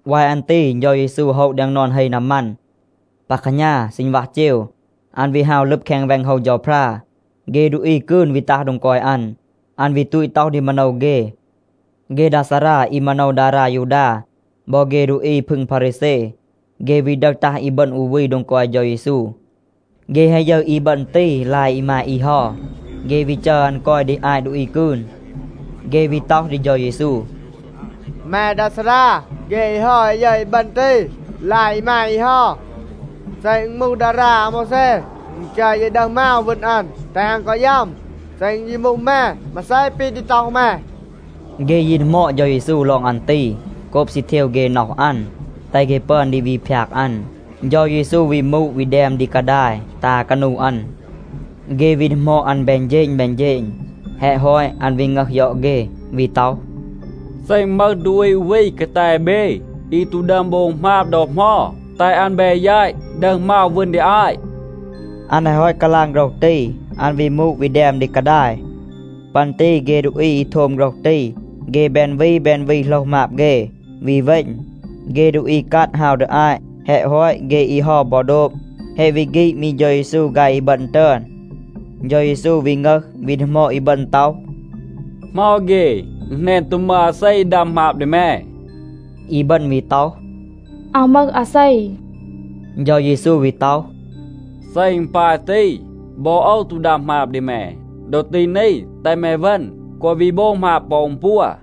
วาย อัน ตี เฌา เยซู โฮะ แดง นอน เฮ นามัน. ปา แคหณา, ซีณวัห เจว, อัน วี ฮาว ลึบ แคง แวง โฮว เฌาพรา. เฆ ดูอี กืน วี ตัห โดง กอย อัน. อัน วี ตูต ต็อห ดี มาโนว เฆ. เฆ ดา ซารา อี มาโนว ดารา ยูดา บอ เฆ ดูอี พึง พารีแซ, เฆ วี ดึห ตัห อีบึณ อู วี โดง กอย เฌา เยซู. เฆ แฮะ ยึร อีบึณ ตี ลาย อีมาย อี เฮา. เฆ วี จัร อัน กอย ดี อาต ดูอี กืน. เฆ วี ต็อห ดี เฌา เยซู, “แม ดา ซารา, เฆ อี เฮา แฮะ ยึร อีบึณ ตี ลาย อีมาย อี เฮา. เซ อึณ มูห ดารา อาโมวแซ, อึณ จัร เย ดึห มาว, วึณ อัน, แตห อัน กอ ยัม. เซ อึณ ยี มูห แม, มาเซ ปี ดี ต็อห แม?” เฆ ยี ดีหมอด เฌา เยซู ลอง อัน ตี, โกบ ซี เทว เฆ น็อห อัน, แตห เฆ ปึอน ดี วี พยาก อัน. เฌา เยซู วี มูด, วี แดม ดี กาดาย, ตา กานู อัน. เฆ วี ดีหมอด อัน แบน เฌณ แบน เฌณ. แฮะ ฮอต, อัน วี งึห ยอด เฆ, วี ต็อห, “เซ อึณ มึห ดูอี อู วี กาแต เบ, อี ตู ดึอม โบง หมาบ ดอ เหมา, แตห อัน แบ แยต, ดึห มาว วึณ ดี อาต.” อัน แฮะ ฮอต กาลาง โฆรห ตี, อัน วี มูด วี แดม ดี กาดาย. ปัน ตี เฆ ดูอี อี โทม โฆรห ตี, เฆ แบน วี แบน วี โหลห หมาบ เฆ, วี เวณ. เฆ ดูอี กัด ฮาว ดี อาต. แฮะ ฮอต เฆ อี เฮา บอ โดบ. แฮะ วี ฆีด มี เฌา เยซู ฆาย อีบึณ ตึอน. เฌา เยซู วี งึห, วี ดีหมอด อีบึณ ต็อห, “เหมา เฆ? อึณ แหนน ตู มึห อาเซ อี ดัม หมาบ ดี แม.” อีบึณ วี ต็อห, “อาว มึห อาเซ.” เฌา เยซู วี ต็อห, “เซ อึณ ปาย ตี, บอ โอว ตู ดัม หมาบ ดี แม. ดอ ตี นี, แตห แม เวณ, แกวะ วี โบง หมาบ ปอ อึณปัว.”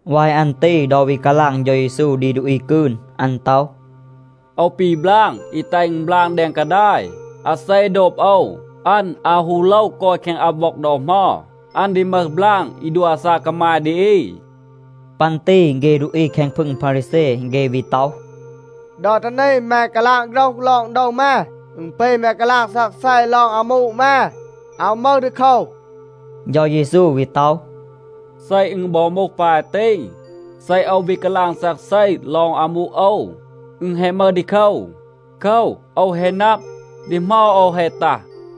วาย อัน ตี ดอ วี กาลาง เฌา เยซู ดี ดูอี กืน, อัน ต็อห, “โอว ปี บลาง อี แตห อึณ บลาง แดง กาดาย. อาเซ โดบ โอว, อัน อาว ฮู โลว กอย แคง อับ ว็อง ดอ เหมา. อัน ดี มึห บลาง อี ดัว อาซาก กามาย ดี อี.” ปัน ตี เฆ ดูอี แคง พึง พารีแซ, เฆ วี ต็อห, “ดอ ตี นี แม กาลาง โฆรห ลอง โดว แม. อึณ ปี แม กาลาง ซักเซ ลอง อามู แม. อาว มึห ดีโคว.” เฌา เยซู วี ต็อห, “เซ อึณ บอ มูห ปาย ตี, เซ โอว วี กาลาง ซักเซ ลอง อามู โอว, อึณ แฮะ มึห ดีโคว. โคว, โอว แฮะ นับ, ดี เหมา โอว แฮะ ตัห.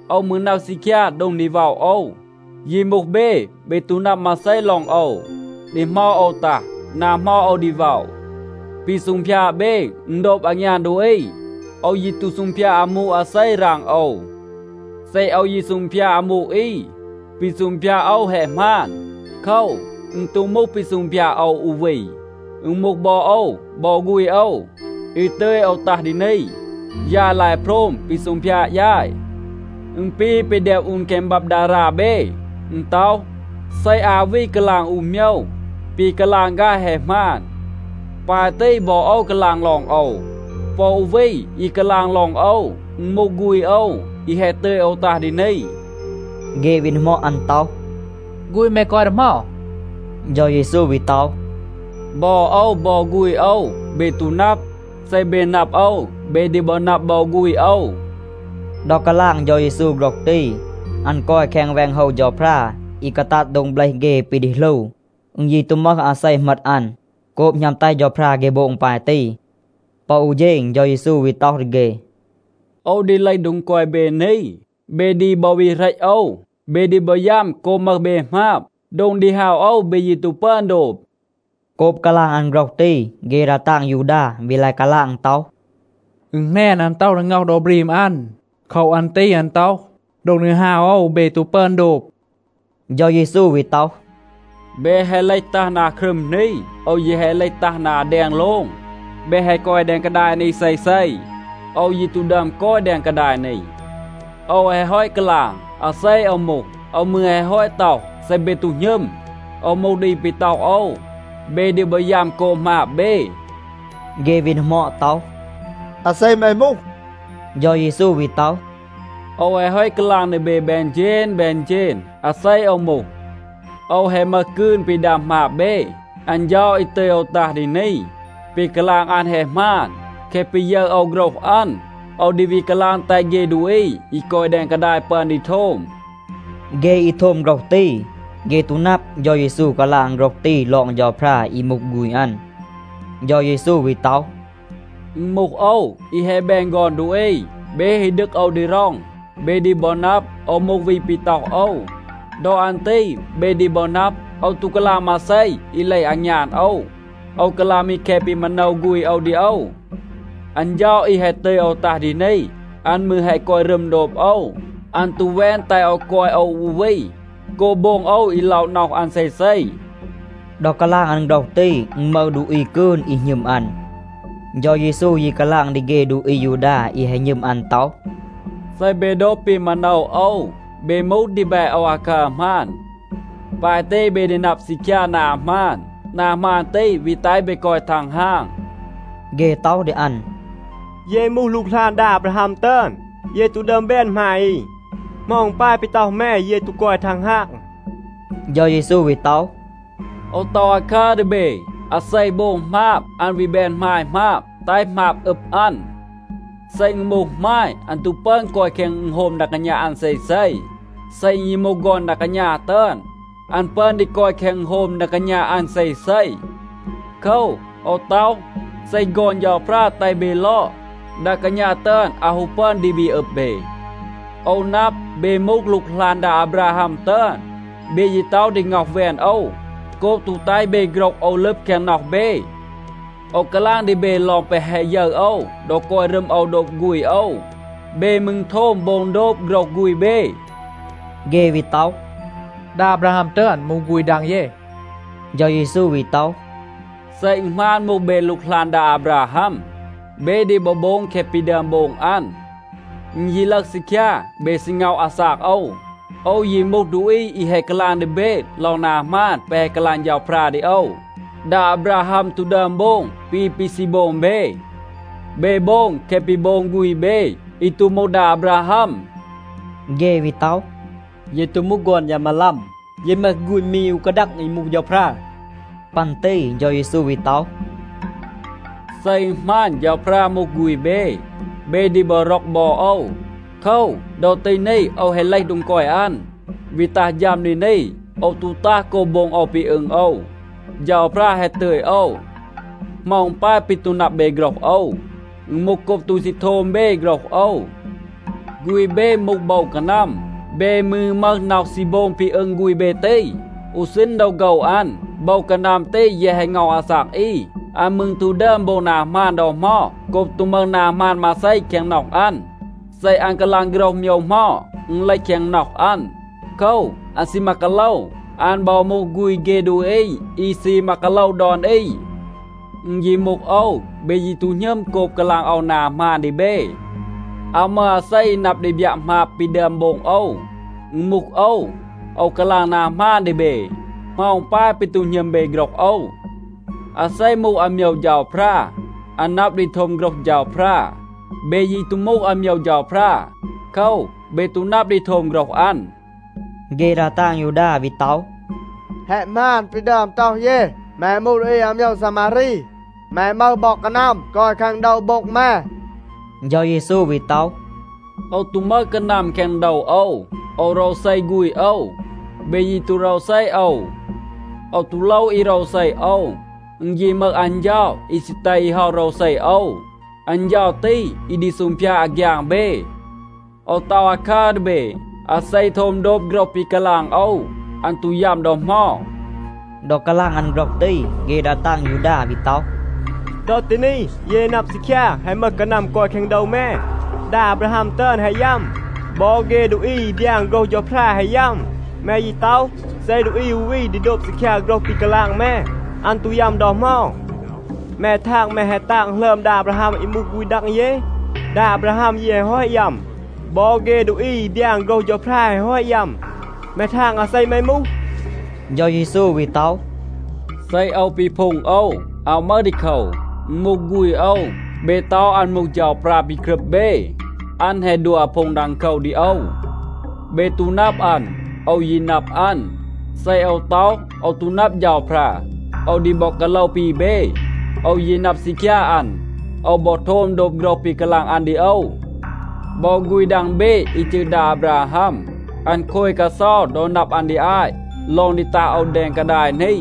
โอว มืร นับ ซีคยา โดง ดี ว็อะ โอว. ยี มูห เบ, เบ ตู นับ มาเซ ลอง โอว, ดี เหมา โอว ตัห, นา เหมา โอว ดี ว็อะ. ปี ซูงพยาด เบ, อึณ โดบ อางยาน ดูอี. โอว ยี ตู ซูงพยาด อามู อาเซ ราง โอว. เซ โอว ยี ซูงพยาด อามู อี, ปี ซูงพยาด โอว แฮะ หมาน. โคว, อึณ ตู มูห ปี ซูงพยาด โอว อู วี. อึณ มูห บอ โอว บอ ฆูณ โอว, อี ตึย โอว ตัห ดี นี. ยาย ลาย โพรม ปี ซูงพยาด ยาย. อึณ ปี ปี แดม อูน แคง บับ ดารา เบ. อึณ ต็อห, เซ อา วี กาลาง อู โมยว, ปี กาลาง ฆาย แฮะ หมาน. ปาย ตี, บอ โอว กาลาง ลอง โอว. ปอ อู วี อี กาลาง ลอง โอว, อึณ มูห ฆูณ โอว, อี แฮะ ตึย โอว ตัห ดี นี.” เฆ วี ดีหมอด อัน ต็อห, “ฆูณ แม กอย ดี เหมา?” เฌา เยซู วี ต็อห, “บอ โอว บอ ฆูณ โอว เบ ตู นับ. เซ เบ นับ โอว, เบ ดี บอ นับ บอ ฆูณ โอว.” ดอ กาลาง เฌา เยซู โฆรห ตี, อัน กอย แคง แวง โฮว เฌาพรา อี กาตัด โดง เบลห เฆ ปี ดี หลู. อึณ ยี ตู มึห อาเซ เหมต อัน, โกบ หณัม แตห เฌาพรา เฆ โบง ปาย ตี. ปอ อู เฌณ เฌา เยซู วี ต็อห ดี เฆ, “โอว ดี เลห โดง กอย เบ นี. เบ ดี บอ วี เหรต โอว. เบ ดี บอ ยัม โกบ มึห เบ หมาบ. โดง ดี ฮาว โอว, เบ ยี ตู ปึอน โดบ.” โกบ กาลาง อัน โฆรห ตี, เฆ ดา ตาง ยูดา วี ลาย กาลาง ต็อห, “อึณ แหนน, อัน ต็อห ดี ง็อห โดว บรีม อัน. โคว อัน ตี อัน ต็อห, ‘โดง ดี ฮาว โอว เบ ตู ปึอน โดบ.’” เฌา เยซู วี ต็อห, “เบ แฮะ เลห ตัห นา ครึม นี. โอว แยะ แฮะ เลห ตัห นา แดง โลง. เบ แฮะ กอย แดง กาดาย นี เซเซ. โอว ยี ตู ดึอม กอย แดง กาดาย นี. โอว แฮะ ฮอต กาลาง, อาเซ โอว มูห. โอว มืร แฮะ ฮอต ต็อห, เซ เบ ตู หณึม, โอว มูห ดูอี ปี ต็อห โอว, เบ ดี บอ ยัม โกบ หมาบ เบ.” เฆ วี ดีหมอด ต็อห, “อาเซ แม มูห?” เฌา เยซู วี ต็อห, “โอว แฮะ ฮอต กาลาง ดี เบ แบน เฌณ แบน เฌณ, อาเซ โอว มูห. โอว แฮะ มึห กืน ปี ดัม หมาบ เบ. อัน เฌา อี ตึย โอว ตัห ดี นี, ปี กาลาง อัน แฮะ หมาน. แคะ ปี ยึร โอว โฆรห อัน, โอว ดี วี กาลาง แตห เฆ ดูอี อี กอย แดง กาดาย ปึอน ดี โทม.” เฆ อี โทม โฆรห ตี, เฆ ตู นับ, เฌา เยซู กาลาง โฆรห ตี ลอง เฌาพรา อี มูห ฆูณ อัน. เฌา เยซู วี ต็อห, “อึณ มูห โอว, อี แฮะ แบน ฆอน ดูอี. เบ ฮี ดึก โอว ดี ร็อง, เบ ดี บอ นับ, โอว มูห วี ปี ต็อห โอว. ดอ อัน ตี เบ ดี บอ นับ, โอว ตู กาลาง มาเซ อี เลห อางยาน โอว. โอว กาลาง มี แคะ ปี มาโนว ฆูณ โอว ดี โอว. อัน เฌา อี แฮะ ตึย โอว ตัห ดี นี, อัน มืร แฮะ กอย รึม โดบ โอว. อัน ตู แวน แตห โอว กอย โอว อู วี โกบ โบง โอว อี ล็อะ น็อห อัน เซเซ.” ดอ กาลาง อัน โฆรห ตี, อึณ มึห ดูอี กืน, อี หณึม อัน. เฌา เยซู ยี กาลาง ดี เฆ ดูอี อายูดา อี แฮะ หณึม อัน ต็อห, “เซ เบ โดบ ปี มาโนว โอว, เบ มูห ดีแบ โอว อาคัร หมาน. ปาย ตี เบ ดี นับ ซีคยา นา หมาน. นา หมาน ตี วี แตห เบ กอย ทังฮาง.” เฆ ต็อห ดี อัน, “เย มูห หลูกหลาน ดา อาบราฮัม ตึอน. เย ตู ดึอม แบน หมาย อี. เหมา อึณ ปาย ปี ต็อห แม, เย ตู กอย ทังฮาง?” เฌา เยซู วี ต็อห, “โอว ต็อห อาคัร ดี เบ. อาเซ โบง หมาบ, อัน วี แบน หมาย หมาบ, แตห หมาบ อึบ อัน. เซ อึณ มูห หมาย, อัน ตู ปึอน กอย แคง อึณโฮม ดา กาณา อัน เซเซ. เซ อึณ ยี มูห ฆอน ดา กาณา ตึอน, อัน ปึอน ดี กอย แคง อึณโฮม ดา กาณา อัน เซเซ. โคว, โอว ต็อห, เซ ฆอน เฌาพรา แตห เบ ลอด, ดา กาณา ตึอน อาว ฮู ปึอน ดี วี อึบ เบ. โอว นับ, เบ มูห หลูกหลาน ดา อาบราฮัม ตึอน. เบ ยี ต็อห ดี ง็อห แวน โอว โกบ ตู แตห เบ โฆรห โอว ลึบ แคง น็อห เบ. โอว กาลาง ดี เบ ลอง แปะ แฮะ ยึร โอว ดอ กอย รึม โอว โดบ ฆูณ โอว. เบ มืร โทม โบง โดบ โฆรห ฆูณ เบ.” เฆ วี ต็อห, “ดา อาบราฮัม ตึอน มูห ฆูณ ดัง เย.” เฌา เยซู วี ต็อห, “เซ อึณ หมาน, มูห เบ หลูกหลาน ดา อาบราฮัม, เบ ดี บอ โบง แคะ ปี ดึอม โบง อัน. อึณ ยี ลึห ซีคยา, เบ ซี ง็อห อาซาก โอว. โอว ยี มูห ดูอี อี แฮะ กาลาง ดี เบ ลอง นา หมาน แปะ แฮะ กาลาง เฌาพรา ดี โอว. ดา อาบราฮัม ตู ดึอม โบง ปี ปี ซี โบง เบ. เบ โบง แคะ ปี โบง ฆูณ เบ, อี ตู มูห ดา อาบราฮัม.” เฆ วี ต็อห, “เย ตู มูห ฆอน ยา มาลัม. เย มึห ฆูณ มี อู กาดัง อี มูห เฌาพรา.” ปัน ตี เฌา เยซู วี ต็อห, “เซ อึณ หมาน, เฌาพรา มูห ฆูณ เบ, เบ ดี บอ ร็อก บอ โอว. โคว, ดอ ตี นี โอว แฮะ เลห โดง กอย อัน, วี ตัห ฌัม ดี นี. โอว ตู ตัห โกบ โบง โอว ปี อึง โอว. เฌาพรา แฮะ ตึย โอว. เหมา อึณ ปาย ปี ตู นับ เบ โฆรห โอว? อึณ มูห โกบ ตู ซี โทม เบ โฆรห โอว. ฆูณ เบ มูห โบว กานัม, เบ มืร มึห น็อห ซี โบง ปี อึง ฆูณ เบ ตี. อู ซีณ ดอ โฆว อัน, โบว กานัม ตี แยะ แฮะ ง็อห อาซาก อี. อัน มืร ตู ดึอม โบง นา หมาน ดอ เหมา โกบ ตู มึห นา หมาน มาเซ แคง น็อห อัน. เซ อัน กาลาง โฆรห โมยว เหมา, อึณ เลห แคง น็อห อัน. โคว, อัน ซีมา กาโลว. อัน บอ มูห ฆูณ เฆ ดูอี อี ซีมา กาโลว ดอน อี. อึณ ยี มูห โอว, เบ ยี ตู หณึม โกบ กาลาง โอว นา หมาน ดี เบ. อาว มึห อาเซ อี นับ ดี บยัะ หมาบ ปี ดึอม โบง โอว. อึณ มูห โอว, โอว กาลาง นา หมาน ดี เบ. เหมา อึณ ปาย ปี ตู หณึม เบ โฆรห โอว? อาเซ มูห อาโมยว เฌาพรา, อัน นับ ดี โทม โฆรห เฌาพรา. เบ ยี ตู มูห อาโมยว เฌาพรา. โคว, เบ ตู นับ ดี โทม โฆรห อัน.” เฆ ดา ตาง ยูดา วี ต็อห, “แฮะ หมาน ปี ดึอม ต็อห เย. แม มูห ดูอี อาโมยว ซามารี. แม มึห บอ กานัม กอย แคง โดว โบ็ง แม.” เฌา เยซู วี ต็อห, “โอว ตู มึห กานัม แคง โดว โอว. โอว โรวเซ ฆูณ โอว. เบ ยี ตู โรวเซ โอว. โอว ตู โลว อี โรวเซ โอว. อึณ ยี มึห อัน เฌา อี ซี แตห อี เฮา โรวเซ โอว. อัน เฌา ตี อี ดี ซูงพยาด อาฆยาง เบ. โอว ต็อห อาคัร ดี เบ. อาเซ โทม โดบ โฆรห ปี กาลาง โอว, อัน ตู ยัม ดอ เหมา.” ดอ กาลาง อัน โฆรห ตี, เฆ ดา ตาง ยูดา วี ต็อห, “ดอ ตี นี, เย นับ ซีคยา, แฮะ มึห กานัม กอย แคง โดว แม. ดา อาบราฮัม ตึอน แฮะ ยัม. บอ เฆ ดูอี อี บยาน โฆรห เฌาพรา แฮะ ยัม. แม ยี ต็อห, เซ ดูอี อู วี ดี โดบ ซีคยา โฆรห ปี กาลาง แม, อัน ตู ยัม ดอ เหมา. แม ทาง, แม แฮะ ตาง หลึอม ดา อาบราฮัม อี มูห ฆูณ ดัง เย? ดา อาบราฮัม ยี แฮะ ฮอต ยัม. บอ เฆ ดูอี อี บยาน โฆรห เฌาพรา แฮะ ฮอต ยัม. แม ทาง อาเซ แม มูห?” เฌา เยซู วี ต็อห, “เซ โอว ปีพูง โอว, อาว มึห ดีโคว. อึณ มูห ฆูณ โอว, เบ ต็อห อัน มูห เฌาพรา ปี กรึบ เบ, อัน แฮะ ดัว อาพูง ดังโคว ดี โอว. เบ ตู นับ อัน. โอว ยี นับ อัน. เซ โอว ต็อห, ‘โอว ตู นับ เฌาพรา,’ โอว ดี บอ กาโลว ปี เบ. โอว ยี นับ ซีคยา อัน. โอว บอ โทม โดบ โฆรห ปี กาลาง อัน ดี โอว. บอ ฆูณ ดัง เบ อี จืร ดา อาบราฮัม, อัน โคย กาเซา ดอ นับ อัน ดี อาต ลอง ดี ตัห โอว แดง กาดาย นี.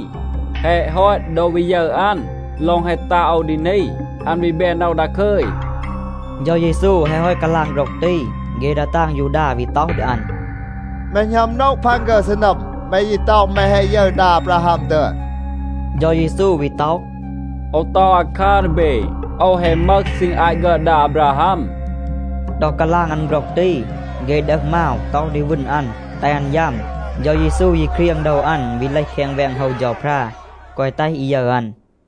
แฮะ ฮอต, ดอ วี ยึร อัน ลอง แฮะ ตัห โอว ดี นี, อัน วี แบน น็อห ดาคึย.” เฌา เยซู แฮะ ฮอต กาลาง โฆรห ตี, เฆ ดา ตาง ยูดา วี ต็อห ดี อัน, “แม หณัม โนะ พัน ฆึร ซีนัม. แม ยี ต็อห, แม แฮะ ยึร ดา อาบราฮัม ตึอน.” เฌา เยซู วี ต็อห, “โอว ต็อห อาคัร ดี เบ. โอว แฮะ มึห ซีณ อาต ฆึอด ดา อาบราฮัม.” ดอ กาลาง อัน โฆรห ตี, เฆ ดึห มาว, ต็อห ดี วึณ อัน, แตห อัน ยัม. เฌา เยซู ยี เครียง โดว อัน, วี เลห แคง แวง โฮว เฌาพรา, แกวะ แตห อี ยึร อัน.